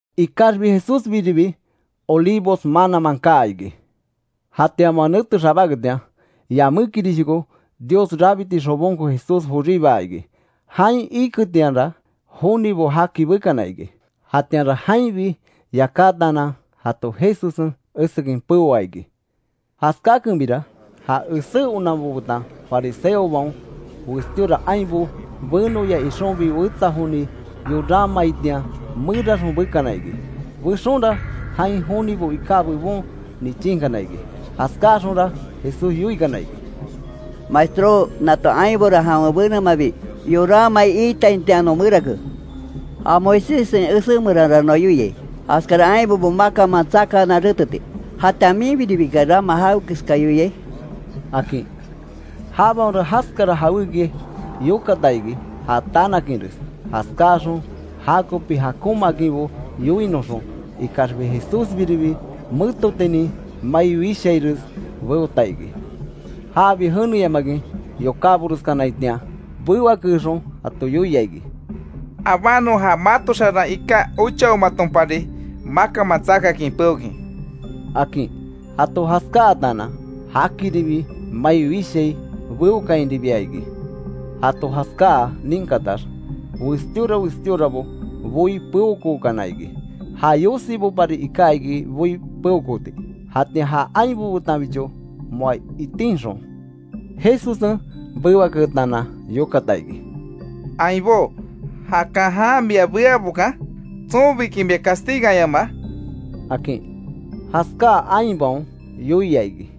Ikaxbi Jesúsbiribi Olivos mananman kaa iki. Jatian moa nete xabáketian yamékirishoko, Dios rabiti xobonko Jesús joríbaa iki. Jain iketianra jonibo jaki bekana iki. Jatianra jainbi yakátaanan, jato Jesussen esekin peoa iki. Jaskákenbira, ja esé onanbo betan fariseobaon, westíora ainbo benoya ixonbi wetsa joni yoranmaitian meraxon bekana iki; bexonra, jain jonibo iká bebon nichinkana iki. Jaskáaxonra Jesús yoikana iki: —Maestró, nato ainbora jawen benemabi yoranmai iitaitian non merake. Ja Moiséssen esé meranra noa yoiai, jaskara ainbobo makanman tsakaanan reteti. Jatian ¿Minbiribiki rama jawekeska yoiai? —akin. Jabaonra jaskara jawéki yokata iki, ja tanakinres, jaskáaxon jakopi jakonmaakinbo yoinoxon. Ikaxbi Jesúsbiribi, metotinin mai wishaires beota iki. Jabi jeneyamakin yokáboreskanaitian bewakeexon jato yoia iki: —Abánon, ja mato xaran iká ochaomatonpari, makanman tsakakin peokin —akin. Jato jaskáatanan, jakiribi mai wishai beókainribia iki. Jato jaskáa ninkatax, westíora westíorabo boí peokookana iki. Ja yosibopari iká iki boí peokooti, jatian ja ainbo betanbicho moa itinxon, Jesussen bewaketaanan yokata iki: —Ainbó, ¿Jakan jan mia beabokan? ¿Tsonbiki mia castiganyamaa? —akin. Jaskáa ainbaon yoia iki: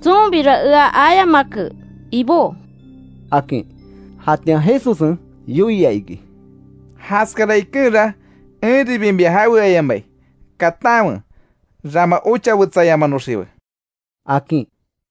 —Tsonbira ea ayamake, Ibó —akin. Jatian Jesussen yoia iki: —Jaskara ikenra, enribi mia jaweayamai. Katanwe; rama ochawetsayamanoxiwe —akin.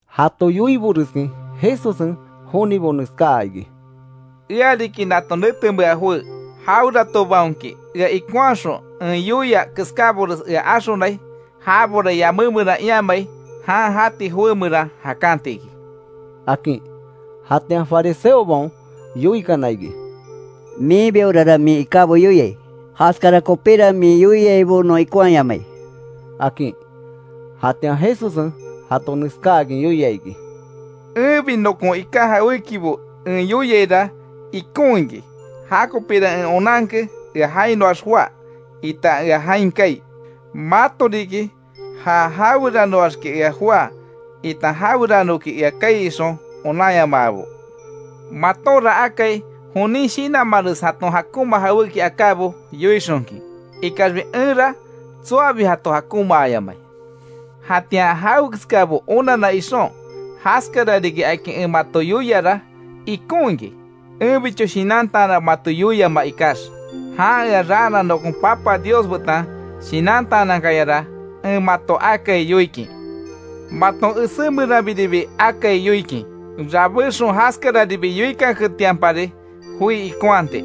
Jato yoiboreskin, Jesussen jonibo neskaa iki: —Ea riki nato netemea joé. Jaweratobaonki ea ikonhaxon, en yoia keskábores ea axonai, jabora yamé meran iamai, jan jati joé meran jakanti iki —akin. Jatian fariseobaon yoikana iki: —Miinbiorara min ikábo yoiai. Jaskara kopíra min yoiaibo non ikonhaayamai —akin. Jatian Jesussen jato neskáakin yoia iki: —Enbi nokon ika jawékibo en yoiaira, ikon iki, jakopira en onanke ea jainoax joá itan ea jain kaai. Mato riki ja jaweranoaxki ea joá itan jaweranoki ea kaai ixon onanyamaabo. Matonra akai, jonin shinanmanres jaton jakonma jawéki akábo yoixonkin, ikaxbi enra tsoabi jato jakonmaayamai. Jatian, jawekeskabo onanna ixon, jaskara riki akin en mato yoiara ikon iki; enbicho shinantaanan mato yoiaima ikax. Jan ea raana nokon Papa Dios betan shinantaanankayara en mato akai yoikin. Maton esé meranbiribi akai yoikin, rabéxon jaskararibi yoikanketianpari joi ikonhati.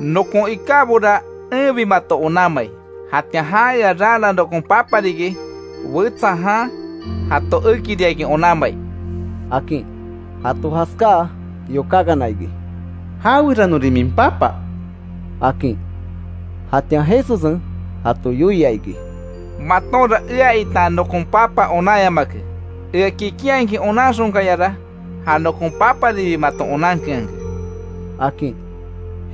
Nokon ikábora enbi mato onanmai. Jatian jan ea raana nokon Papa riki wetsa jan jato ekiriakin onanmai —akin. Jato jaskáa yokákana iki: —¿Jaweranorin min Papa? —akin. Jatian Jesussen jato yoia iki: —Matonra ea itan nokon Papa onanyamake, ea kikinhakin onanxonkayara, ja nokon Paparibi maton onankeanke —akin.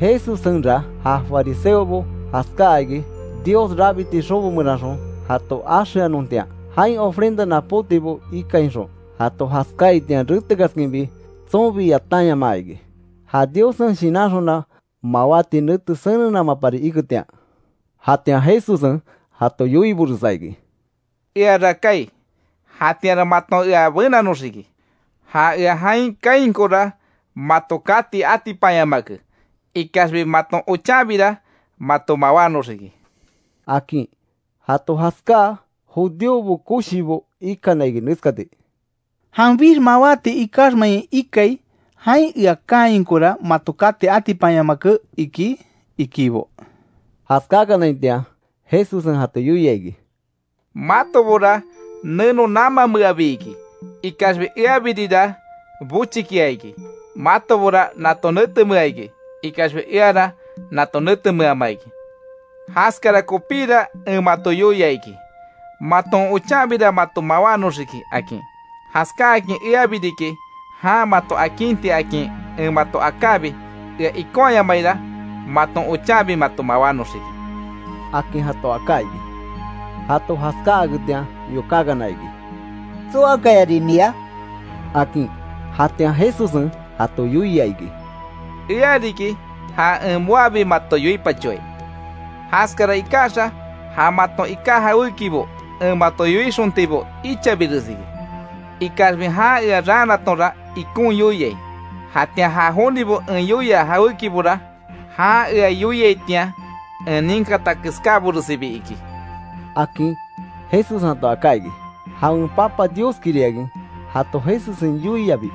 Jesussenra ja fariseobo jaskáa iki, Dios rabiti xobo meranxon jato axeanontian; jain ofrenda napótibo ikainxon. Jato jaskáaitian, retekaskinbi tsonbi yatanyamaa iki, ja Diossen shinanxona mawáti nete senennamapari iketian. Jatian Jesussen jato yoiboresa iki: —Eara kaai, jatianra maton ea benanoxiki; ja ea jain kaainkora mato kati atipanyamake. Ikaxbi maton ochanbira mato mawánoxiki —akin. Jato jaskáa, judíobo koshibo ikana iki neskati: —¿Janbix mawáti ikaxmein ikai, jain ea kaainkora mato kati atipanyamake, iki? —ikibo. Jaskakanaitian, Jesussen jato yoia iki: —Matobora neno namanmeabi iki, ikaxbi eabiribira bochikia iki; matobora nato netemea iki, ikaxbi eara nato netemeama iki. Jaskara kopíra en mato yoia iki, maton ochanbira mato mawánoxiki, akin. Jaskáakin Eabi riki jan mato akinti akin en mato akábi ea ikonhayamaira, maton ochanbi mato mawánoxiki —akin jato aká iki. Jato jaskáaketian yokákana iki: —¿Tsoakayarin mia? —akin. Jatian Jesussen jato yoia iki: —Ea riki, ja en moabi mato yoipachoai. Jaskara ikaxa, ja maton iká jawékibo en mato yoixontibo ichabires iki, ikaxbi jan ea raanatonra ikon yoiai. Jatian ja jonibo en yoia jawékibora, jan ea yoiaitian en ninkata keskáboresibi iki —akin Jesussen jato aká iki. Jawen Papa Dioskiriakin jato Jesussen yoiabi,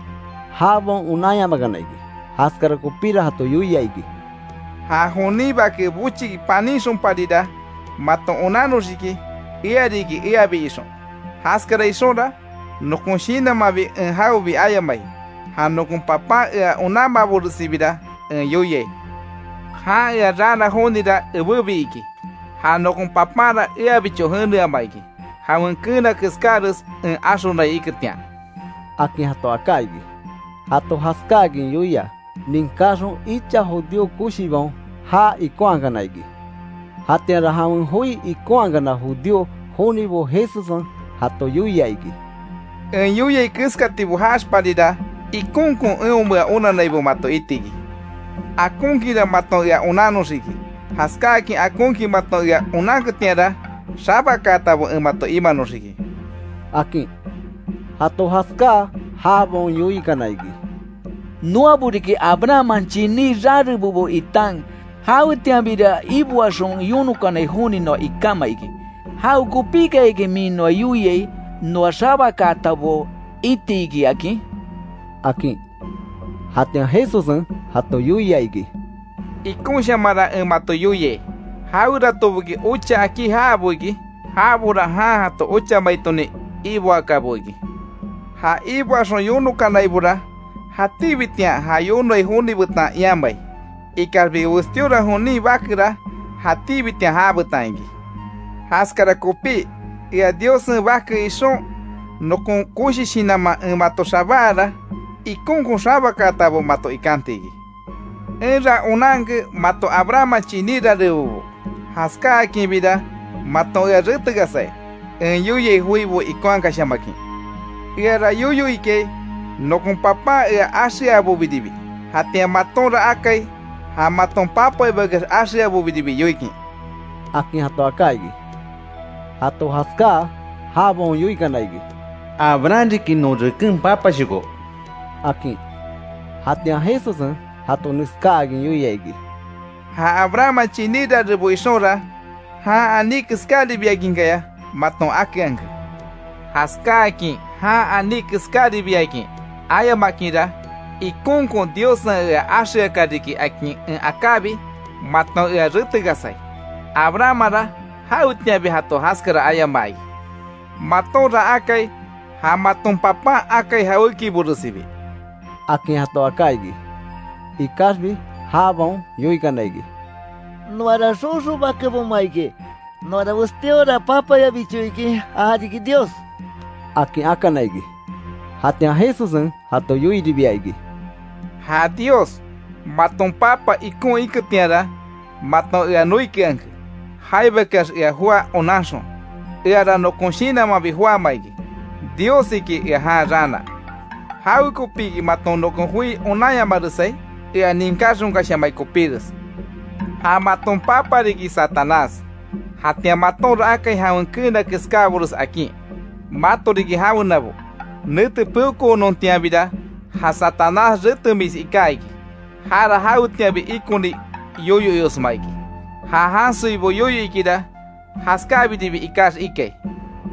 jabaon onanyamakana iki. Jaskara kopíra jato yoia iki: —Ja jonin Bake bochiki panínxonparira maton onannoxiki Ea riki, Eabi ixon, jaskara ixonra nokon shinanmanbi en jawebi ayamai, ja nokon Papan ea onanmaaboresibira en yoiai. Jan ea raana jonira ebébi iki. Ja nokon Papanra eabicho jeneama iki, jawen keena keskáres en axonai iketian —akin jato aká iki. Jato jaskáakin yoia, ninkaxon icha judío koshibaon já ikonhakana iki. Jatianra jawen joi ikonhakana judío jonibo Jesussen jato yoia iki: —En yoiai keskatibo jaaxparira ikonkon eonmea onannaibo mato itiki. Akonkinra maton ea onannoxiki, jaskáakin akonkin maton ea onanketianra, xabakaatabo en mato imanoxiki —akin. Jato jaskáa, jabaon yoikana iki: —Noabo riki Abrahamman chiní rarebobo itan jawetianbira iboaxon yonokanai joni noa ikama iki ¿Jawekopikayaki min noa yoiai, noa xabakaatabo itiki akin? —akin. Jatian Jesussen jato yoia iki: —Ikonshamanra en mato yoiai, jaweratoboki ocha akí jaabo iki, jabora jan jato ochamaitonin iboakabo iki. Ja iboaxon yonokanaibora, jatíbitian ja yonoai joni betan iamai, ikaxbi westíora jonin bakera jatíbitian jabetan iki. Jaskara kopí ea Diossen Bake ixon, nokon koshi shinanman en mato xabáara, ikonkon xabakaatabo mato ikanti iki. Enra onanke mato Abrahamman chiní rarebobo jaskákinbira maton ea retekasai, en yoiai joibo ikonhakashamakin. Eara yoyo ikai nokon Papan ea axeabobiribi, jatian matonra akai ja maton papaibakeax axeabobiribi yoikin —akin jato aká iki. Jato jaskáa jabaon yoikana iki: —Abraham riki, non reken papashoko —akin. Jatian Jesussen jato neskáakin yoia iki: —Ja Abrahamman chiní rarebo ixonra, jan aní keskáribiakinkaya maton akeanke. Jaskáakin jan aní keskáribiakin ayamakinra, ikonkon Diossen ea axeaka riki akin en akábi, maton ea retekasai. Abrahammanra, jawetianbi jato jaskara ayamaa iki. Matonra akai ja maton papan akai jawékiboresibi —akin jato aká iki. Ikaxbi jabaon yoikana iki: —¡Noara xoxo bakeboma iki, noara westíora papayabicho iki já riki Dios! —akin akana iki. Jatian Jesussen jato yoiribia iki: —Ja Dios maton papa ikon iketianra, maton ea noikeanke; jaibakeax ea joá onanxon. Eara nokon shinanmanbi joáma iki, Diossiki ea jan raana. ¿Jawekopiki maton nokon joi onanyamaresai? Ea ninkáxonkashamai kopíres. Ja maton papa riki Satanás, jatian matonra akai jawen keena keskábores akin, mato riki jawenabo. Nete peokoonontianbira ja Satanás retemis iká iki, jara jawetianbi ikoni yoyo iosma iki, ja jansoibo yoyo ikira jaskábiribi ikax ikai,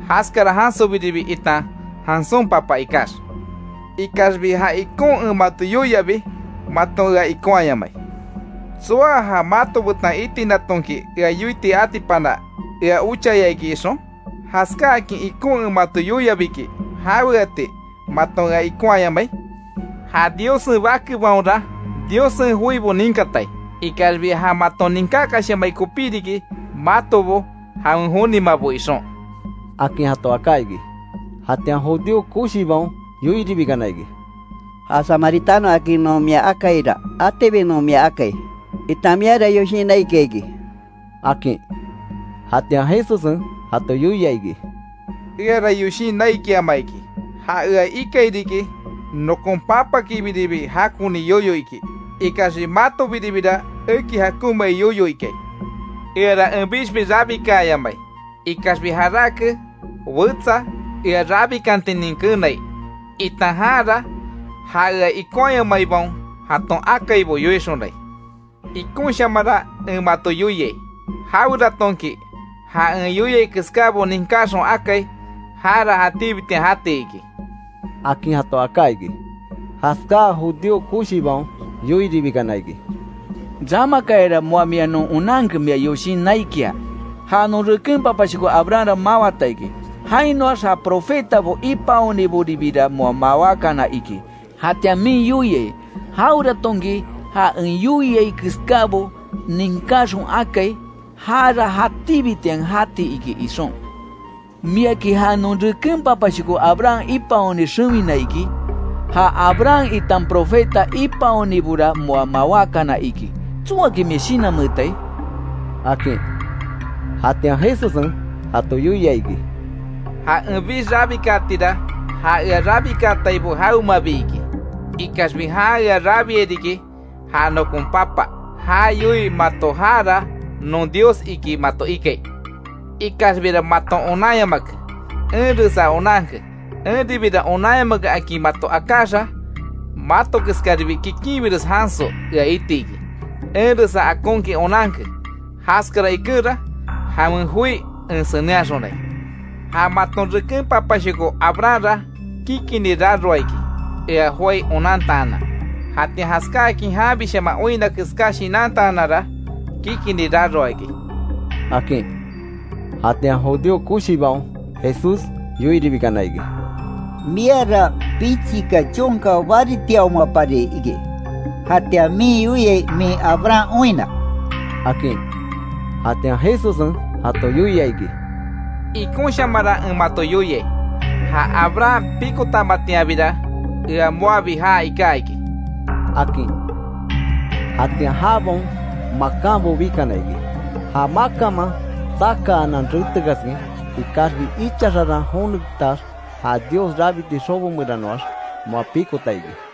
jaskara jansobiribi itan jansón papa ikax. Ikaxbi ja ikon en mato yoiabi, maton ea ikonhayamai. ¿Tsoa ja mato betan itinatonki ea yoiti atipana ea ochaya iki ixon? Jaskáakin ikon en mato yoiabiki ¿Jaweati maton ea ikonhayamai? Ja Diossen bakebaonra, Diossen joibo ninkatai, ikaxbi ja maton ninkakashamai kopí riki matobo jawen jonimabo ixon —akin jato aká iki. Jatian judío koshibaon yoiribikana iki: —Ja Samaritano akin non mia akaira, atibi non mia akai, itan miara yoshin naikia iki —akin. Jatian Jesussen jato yoia iki: —Eara yoshin naikiama iki. Ja ea ikairiki nokon Papakibiribi jakoni yoyo iki, ikaxbi matobiribira eki jakonmai yoyo ikai. Eara enbixbi rabikaayamai, ikaxbi jarake wetsa ea rabikantinin keenai, itan janra ja ea ikonhayamaibaon jaton akaibo yoixonai. Ikonshamanra en mato yoiai, jaweratonki ja en yoiai keskábo ninkaxon akai, jara jatíbitian jati iki —akin jato aká iki. Jaskáa judío koshibaon yoiribikana iki: —Ramakayara, moa mia non onanke, mia yoshin naikia. Ja non reken papashoko Abrahamra mawata iki. Jainoax ja profetabo ipaoniboribira moa mawákana iki. Jatian min yoiai: ‘Jaweratonki ja en yoiai keskábo ninkaxon akai, jara jatíbitian jati iki’, ixon. ¿Miaki ja non reken papashoko Abraham ipaoni xewina iki? Ja Abraham itan profeta ipaonibora moa mawákana iki ¿Tsoaki mia shinanmeetai? —akin. Jatian Jesussen jato yoia iki: —Ja enbix rabikaatira, ja ea rabikaataibo jawemabi iki. Ikaxbi jan ea rabiai riki ja nokon Papa. Ja yoii mato jara non Dios iki mato ikai. Ikaxbira maton onanyamake, enresa onanke, Enribira onanyamake akin mato akáxa mato keskaribi kikinbires janso ea itiki. Enresa akonkin onanke. Jaskara ikenra jawen joi en senenhaxonai. Ja maton reken papashoko Abrahamra kikini raroa iki ea joái onantaanan, jatian jaskáakin janbishaman oinna keská shinantaananra, kikini raroa iki —akin. Jatian judío koshibaon Jesús yoiribikana iki: —Miara pichika chonka baritiaomapari iki ¿Jatian min yoiai min Abraham oinna? —akin. Jatian Jesussen jato yoia iki: —Ikonshamanra en mato yoiai, Ja Abraham pikotamatianbira, ea moabi já iká iki —akin. Jatian jabaon makanbo bikana iki, ja makanman tsakaanan retekaskin. Ikaxbi icha xaran jonetax ja Dios rabiti xobo meranoax moa pikota iki.